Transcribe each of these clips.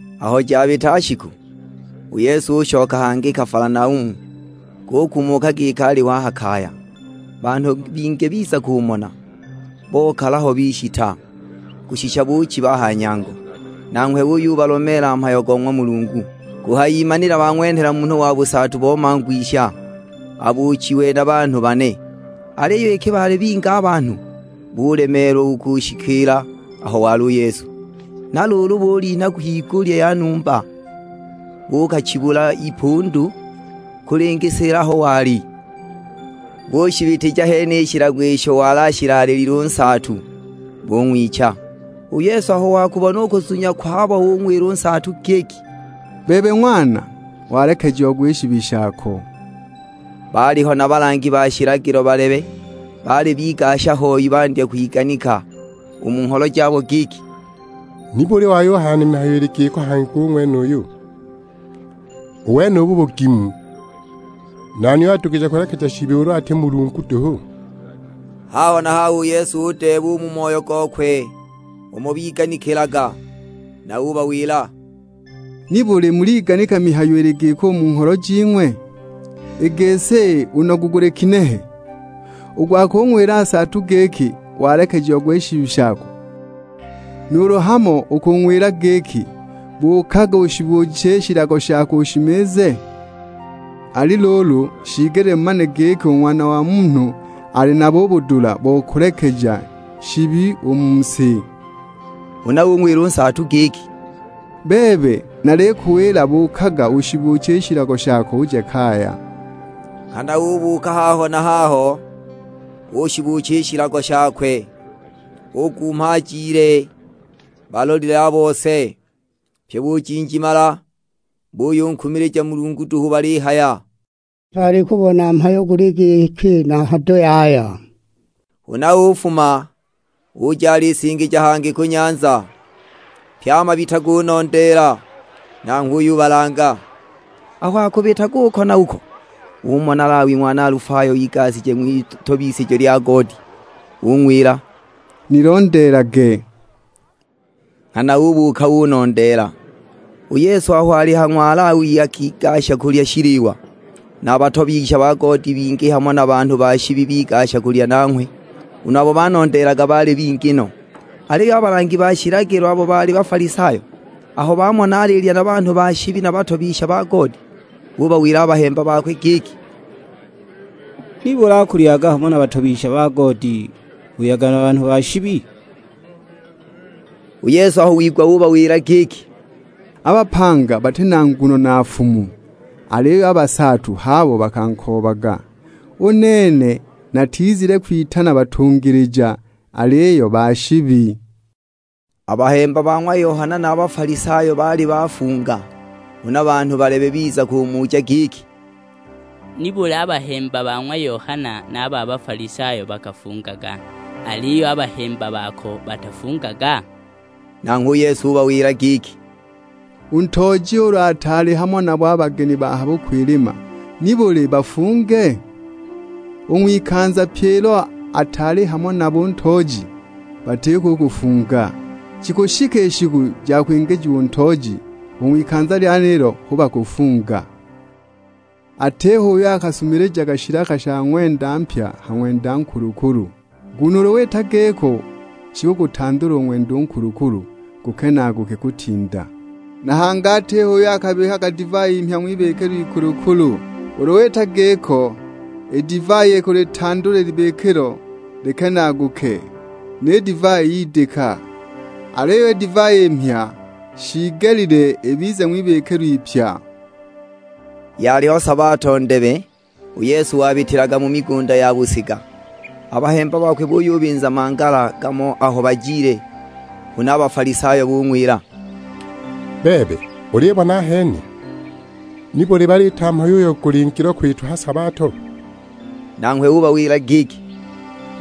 Aho jabita shiku, u Yesu ushoka hangi i Kafalanaumu; gukumuka giki aliho a ha kaya. Banhu bingi biza kumona, bokala ho bishita; kushisha buchiba a ha nyango. Nanghwe uyubalomeela mhayo go ng'wa Mulungu. Kuhayimanila bang'wenhela munhu wa busaatu bo mangwisha, abuuchiwe na banhu bane. Aliyo iki baali bingi a banhu, bulemeelwa u kushikiila aho wali u Yesu. Na luulu bulinha kwigulya ya numba, buukachibula ipundu kulingisila aho wali, bushibitija hene i shilago isho wali ashilaalilile u nsaatu, bung'wicha. U Yesu aho wakubona u kuzunya kwabo ung'wila u nsaatu giki, "Bebe ng'wana, walekejiagwa i shibi shako." Baaliho na balangi ba shilagilo balebe, baali bigasha hoi; bandya kwiganika u mu ngholo jabo giki, "Nibuli wayuhaya na mihayo ili giko hangi u ng'wenuyu? U wenubu bugimu! Nani uyo adugije kulekeja shibi ulu ati Mulungu duhu?" Haho na haho u Yesu udeeba u mu moyo gokwe umo biganikilaga. Na ubawila, "Nibuli muliganika mihayo ili giko u mu ngholo jing'we? I gisi, u nogu guli ginehe? U gwa kung'wila u nsaatu giki, 'Walekejiagwa i shibi shako,' nuulu hamo u kung'wila giki, 'Buukaga ushibuuche i shilago shako ushimize?' Ali luulu, shiigelile mumane giki u Ng'wana wa Munhu ali nabo u budula bo kulekeja shibi u mu si." Huna ung'wila u nsaatu giki, "Bebe, nalikuwila buukaga ushibuuche i shilago shako uje kaya." Nghana ubuuka haho na haho, ushibuucha i shilago shakwe, ugumha ajile balolile a bose! Pyi bujinjimala, buyunkumilija Mulungu duhu balihaya, "Tutaali kubona mhayo guli giki na hado yaya!" Huna ufuma, uja alisingija hangi ku nyanza; pye a mabita gunondeela, nanghwe uyubalanga. Aho akubitaga uko na uko, umona Lawi ng'wana Alifayo igashije ng'witobisijo lya goodi; ug'wila, "Nilondeelage." Nghana ubuuka unondeela. U Yesu aho ali ha ng'wa Lawi akigasha kulya shiliwa, na batobisha ba goodi bingi hamo na banhu ba shibi bigasha kulya nanghwe, na a bahemba bakwe. Nguno abo banondeelaga baali bingi no. Aliyo a balangi ba shilagilo abo baali Bafalisayo, aho bamona alilya na banhu ba shibi na batobisha ba goodi, bubawila a bahemba bakwe giki, "Nibuli akulyaga hamo na batobisha ba goodi, buyaga na banhu ba shibi?" U Yesu aho wigwa ubawila giki, "A bapanga bati na nguno na nfumu, aliyo a basaatu h'abo bakankoobaga. U nene natizile kwitana batungilija, aliyo ba shibi!" A bahemba ba ng'wa Yohana na a ba Bafalisayo baali bafunga. Huna banhu balebe biza kumuja giki, "Nibuli a bahemba ba ng'wa Yohana na a ba Bafalisayo bakafungaga, aliyo a bahemba bako batafungaga?" Nanghwe u Yesu ubawila giki, "U ntooji ulu ataali hamo nabo a bageni ba ha bukwilima, nibuli bafunge? U ng'wikanza pye ilo ataali hamo nabo u ntooji, batiko u kufunga. Jikushika i shiku ja kwingijiwa u ntooji, u ng'wikanza lyenilo hu bakuyufunga. Atiho uyo akasumilijaga shilaka sha ng'wenda mpya ha ng'wenda nkulukulu, nguno ulu wita giko shikugutandula u ng'wenda u nkulukulu gukenaaguke kutinda. Na hangi atiho uyo akabikaga divai mhya ng'wibikilo ikulukulu, ulu wita giko, i divai ikulitandula i libikilo likenaaguke, ni divai yidika! Aliyo i divai i mhya shiigelile ibize ng'wibikilo ipya!" Yaliho sabato ndebe, u Yesu wabitilaga mu migunda ya busiga, a bahemba bakwe buyubinza mangala gamo aho bajile. Huna a Bafalisayo bung'wila, "Bebe, ulibona ahene! Nibuli baliita mhayo uyo guli ngilo kwitwa ha sabato?" Nanghwe ubawila giki,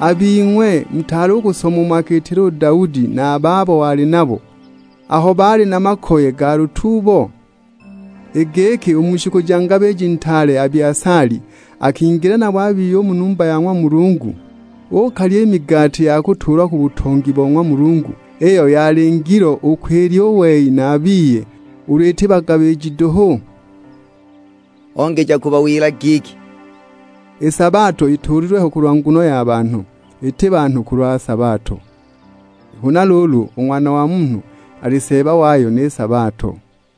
"A bing'we mutaali u kusoma umo akiitila u Daudi na a babo wali nabo, aho baali na makoye ga lutuubo? I giki u mu shiku ja ngabiji ntaale Abiasali akingila nabo a biye u mu numba ya ng'wa Mulungu, uukalya migati ya kutuulwa ku butongi bo ng'wa Mulungu, iyo yali ngilo u kwilya u wei na a biye, ulu iti bagabiji duhu?" Ongeja kubawila giki, "I sabato ituulilwe ho kulwa nguno ya banhu, iti banhu kulwa sabato. Huna luulu, u Ng'wana wa Munhu ali Seeba wayo ni sabato."